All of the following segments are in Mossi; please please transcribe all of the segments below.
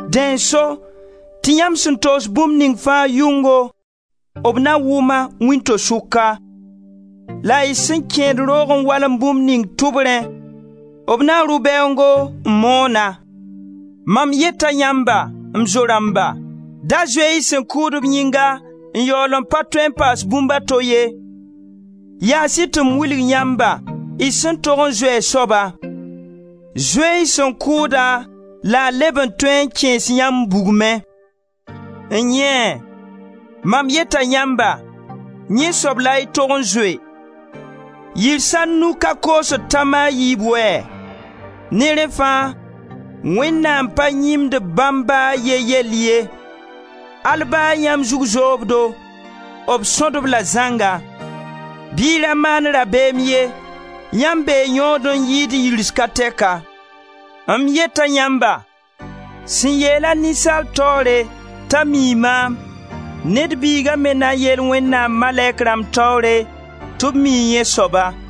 Dẽ n so tɩ yãmb sẽn togs bũmb ning fãa yʋngo, b na wʋm-a wĩnto-sʋka, la y sẽn kẽed roog n walm bũmb ning tʋbrẽ, b na rʋ bɛoongo n moon-a. Mam yeta yãmba, m zo-rãmba, da zoe-y sẽn kʋʋd-b yĩnga n yaool n pa tõe n paas bũmb a to ye. Yaas-y tɩ m wilg yãmba, y sẽn tog n zoe a soaba. Zoe-y sẽn kʋʋda la a leb n tõe n kẽes yãmb bugmẽ. N-yẽe! Mam yeta yãmba, yẽ soab la y tog n zoe. Yirs a nu ka koosd tãm a yiib wɛɛ? Ne rẽ fãa Wẽnnaam pa yĩmd bãmb ba a ye yell ye. Al ba yãmb zug zobdo, b sõd-b-la zãnga. Bɩ y ra maan rabeem ye, yãmb bee yõod n yɩɩd yirs ka tɛka. M yeta yãmba, sẽn yeel-a ninsaalb taoore t'a mii maam, Ned Biiga me na yeel Wẽnnaam malɛk rãmb taoore, tɩ b mii yẽ soaba.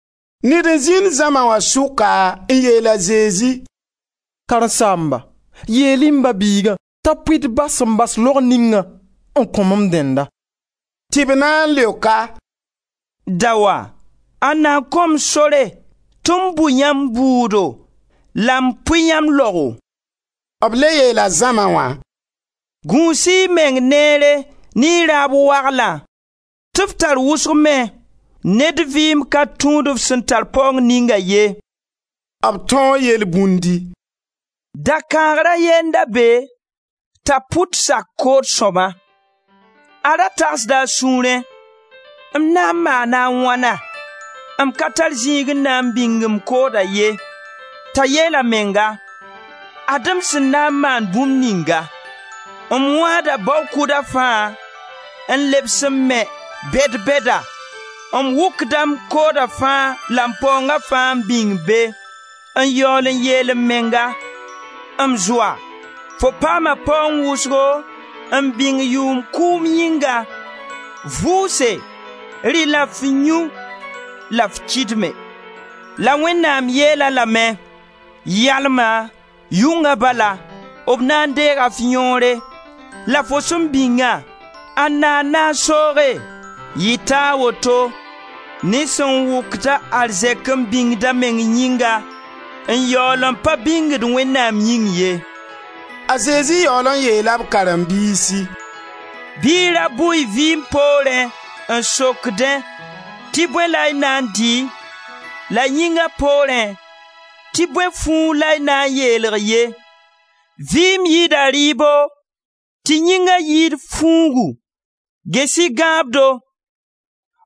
Ned n zĩnd zãma wã sʋka n yeel a Zezi: «Karen-saamba, yeel-y m ba-biiga t'a pʋɩ d ba sẽn bas laog ningã, n kõ-m m dẽnna.» Tɩ b na n leok-a: «Daoa! Ãnda n kõ-m sore tɩ m bʋ yãmb bʋʋdo la m pʋɩ yãmb laogo?» B le yeela zãma wã: «Gũus-y y meng neere ne y raab waglã, tɩ f tar wʋsg me, ned vɩɩm ka tũud f sẽn tar paoong ninga ye.» B tãoo yelbũndi: «Dakãagr a ye n da be ta pʋt sak kood sõma. A ra tagsda a sũurẽ: ‹M na n maana wãna? M ka tar zĩig n na n bĩng m kooda ye.› T'a yeel a menga: ‹Ad-m sẽn na n maan bũmb ninga: m wãada bao kʋda fãa n lebs n me bɛd-bɛda, m wʋkda m kooda fãa la m paoonga fãa n bĩng be, n yaool n yeel m menga: M zoa, fo paama paoong wʋsgo n bĩng yʋʋm kʋʋm yĩnga, vʋʋse, rɩ la f yũ la f kɩdme.› La Wẽnnaam yeel-a lame: ‹Yalma, yʋnga bala, b na n deega f yõore la fo sẽn bĩngã ãnna n na n sooge?› Yɩta a woto ne sẽn wʋkd-a arzɛk n bĩngd a meng yĩnga, n yaool n pa bĩngd Wẽnnaam yĩng ye.» A Zezi yaool n yeela b karen-biisi: «Bɩ y ra bʋ y vɩɩm poorẽ, n sokdẽ tɩ bõe la y na n dɩ, la yĩnga poorẽ, tɩ bõe fuug la y na n yeelg ye. Vɩɩm yɩda rɩɩbo tɩ yĩnga yɩɩd fuugu. Ges-y gãabdo: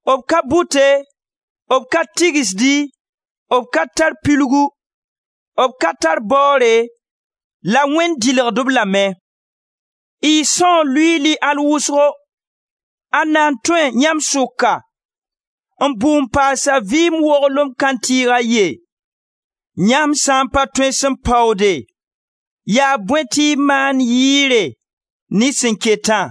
b ka bʋte, b ka tigsdi, b ka tar pilgu, b ka tar baoore, la Wẽnd dɩlgd-b lame. Y são luiili al wʋsgo! Ãnna n tõe, yãmb sʋka, n bʋ n paas a vɩɩm woglem kãntɩɩg a ye? Yãmb sã n pa tõe sẽn paoode, ya bõe tɩ y maand yɩɩre ne sẽn ketã?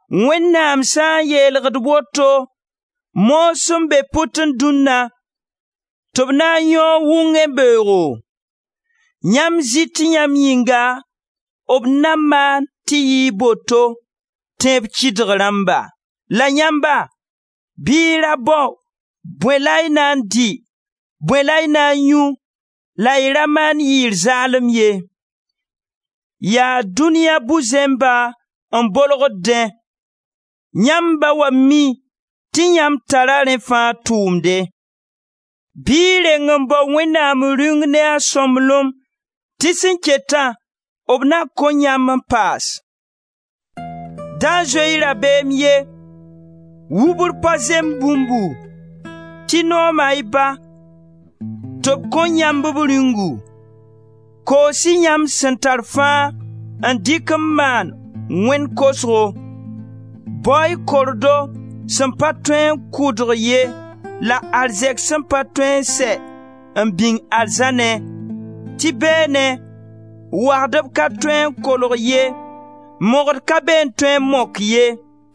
Wẽnnaam sã n yeelgd woto, moog sẽn be pʋtẽ dũnna tɩ b na n yõog wʋngẽ beoogo, yãmb zɩ tɩ yãmb yĩnga b na maan tɩ yɩɩg boto, tẽeb kɩdg rãmba? La yãmba, bɩ y ra bao bõe la y na n dɩ, bõe la y na n yũ, la y ra maan yɩɩr zaalem ye. Yaa dũniya bu-zẽmba n bolgd dẽ. Yãmb Ba wã mi tɩ yãmb tara rẽ fãa tʋʋmde. Bɩ y reng n bao Wẽnnaam Rĩung ne a sõmblem, tɩ sẽn ketã, b na kõ yãmb n paas. Da zoe-y rabeem ye, wubr pa zemb bũmbu, tɩ nooma y Ba tɩ b kõ yãmb b Rĩungu. Koos-y yãmb sẽn tar fãa n dɩk n maan wẽn-kosgo; bao-y kordo sẽn pa tõe n kʋdg ye la arzɛk sẽn pa tõe n sɛ n bĩng arzãnẽ, tɩ beene, wagdb ka tõe n kolg ye, mogd ka be n tõe n mok ye.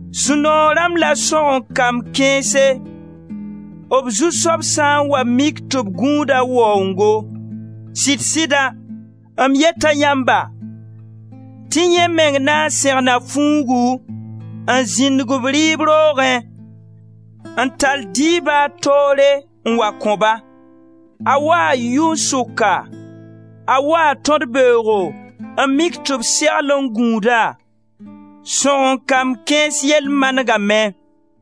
Sũ-noog rãmb la sõgen-kamb kãense, b zu-soab sã n wa mik tɩ b gũud a waoongo. Sɩd-sida, m yeta yãmba tɩ yẽ meng na n sẽgna fuugu, n zĩndg-b rɩɩb roogẽ, n tall dɩɩbã a toore n wa kõ-ba. A waa yʋn-sʋka, a waa tõd-beoogo n mik tɩ b segl n gũud-a, sõgen-kamb kãens yell manegame.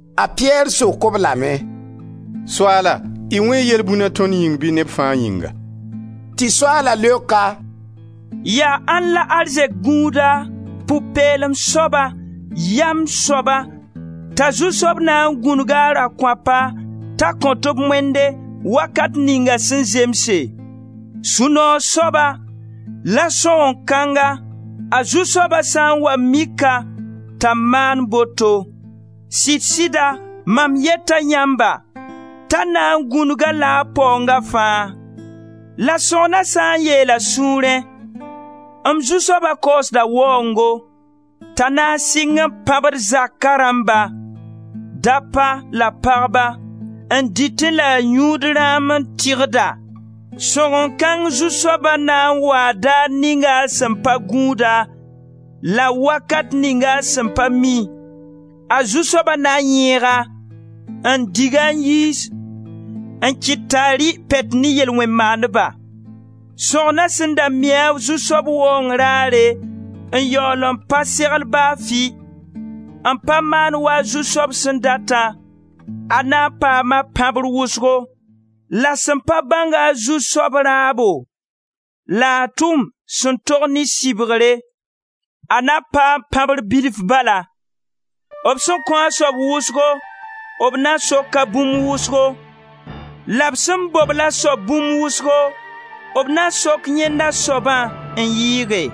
A Piyɛr sok-b lame: «Soaala y wẽe yelbũna tõnd yĩng bɩ neb fãa yĩnga?» Tɩ Soaala leok-a: «Yaa ãnd la arzɛk gũuda, pʋ-peelem soaba, yam soaba t'a zu-soab na n gũnug-a a rakõapa t'a kõt-b moende wakat ninga sẽn zemse? Sũ-noog soaba, la sõgen-kãnga, a zu-soaba sãn n wa mik-a t'a maan boto! Sɩd-sɩda mam yeta yãmba t'a na n gũnug-a-la a paoonga fãa. La sõgna sã n yeel a sũurẽ: ‹M zu-soab kaoosda waoongo› t'a na n sɩng n pãbd zaka rãmba: dapa la pagba, n dɩtẽ la a yũud rãam n tɩgda, sõgen-kãng zu-soaba na n waa daar ning a sẽn pa gũud-a la wakat ning a sẽn pa mi; a zu-soaba na yẽeg-a, n dig-a n yiis, n kɩt t'a rɩ pɛt ne yel-wẽn-maandba. Sõgna sẽn da mi a zu-soab waoong raare n yaool pa segl ba fɩ, n pa maan wa a zu-soaba sẽn datã, a na n paama pãbr wʋsgo. La sẽn pa bãnga a zu-soab raabo la a tʋm sẽn tog ne sɩbgre, a na paam pãbr bilfu bala. B sẽn kõ a soab wʋsgo b na soka bũmb wʋsgo la b sẽn bobl a soab bũmb wʋsgo b na sok yẽnd a soabã n yɩɩge.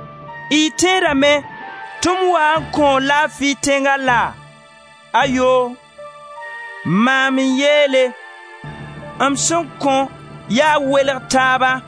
Y tẽedame tɩ m waa n kõo laafi tẽnga laa? Ayoo! Maam n yeele: m sẽn kõ yaa welg taaba.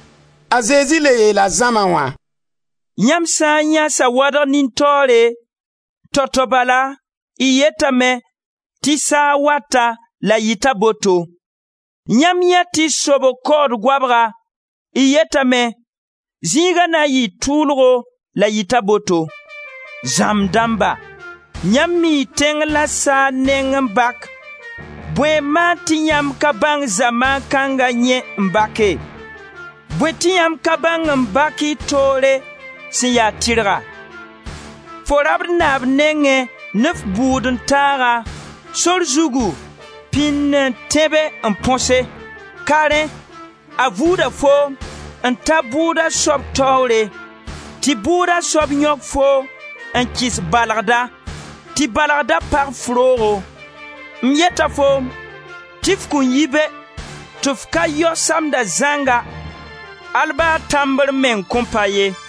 A Zezi le yeela zãma wã: «Yãmb sã n yãe sawadg nin-taoore, tao-tao bala y yetame tɩ saag wata la yɩta boto. Yãmb yãe tɩ sobg kaood goabga, y yetame: zĩiga na n yɩɩ tʋʋlgo la yɩta boto. Zãmb dãmba, yãmb mii tẽng la saag neng n bak, bõe n maan tɩ yãmb ka bãng zamaan kãnga yẽ n bake? Bõe tɩ yãmb ka bãng n bak y toore sẽn ya tɩrga? Fo rabd naab nengẽ ne f bʋʋd-n-taaga, sor zugu, pĩn n tẽbe n põse; ka rẽ a vuuda foom n ta bʋʋda soab taoore, tɩ bʋʋda soab yõk foom n kɩs balgda, tɩ balgda pag f roogo. M yeta foom tɩ f kõn yi be, tɩ f ka yao samda zãnga, al ba tãmbr meng kõn pa ye.»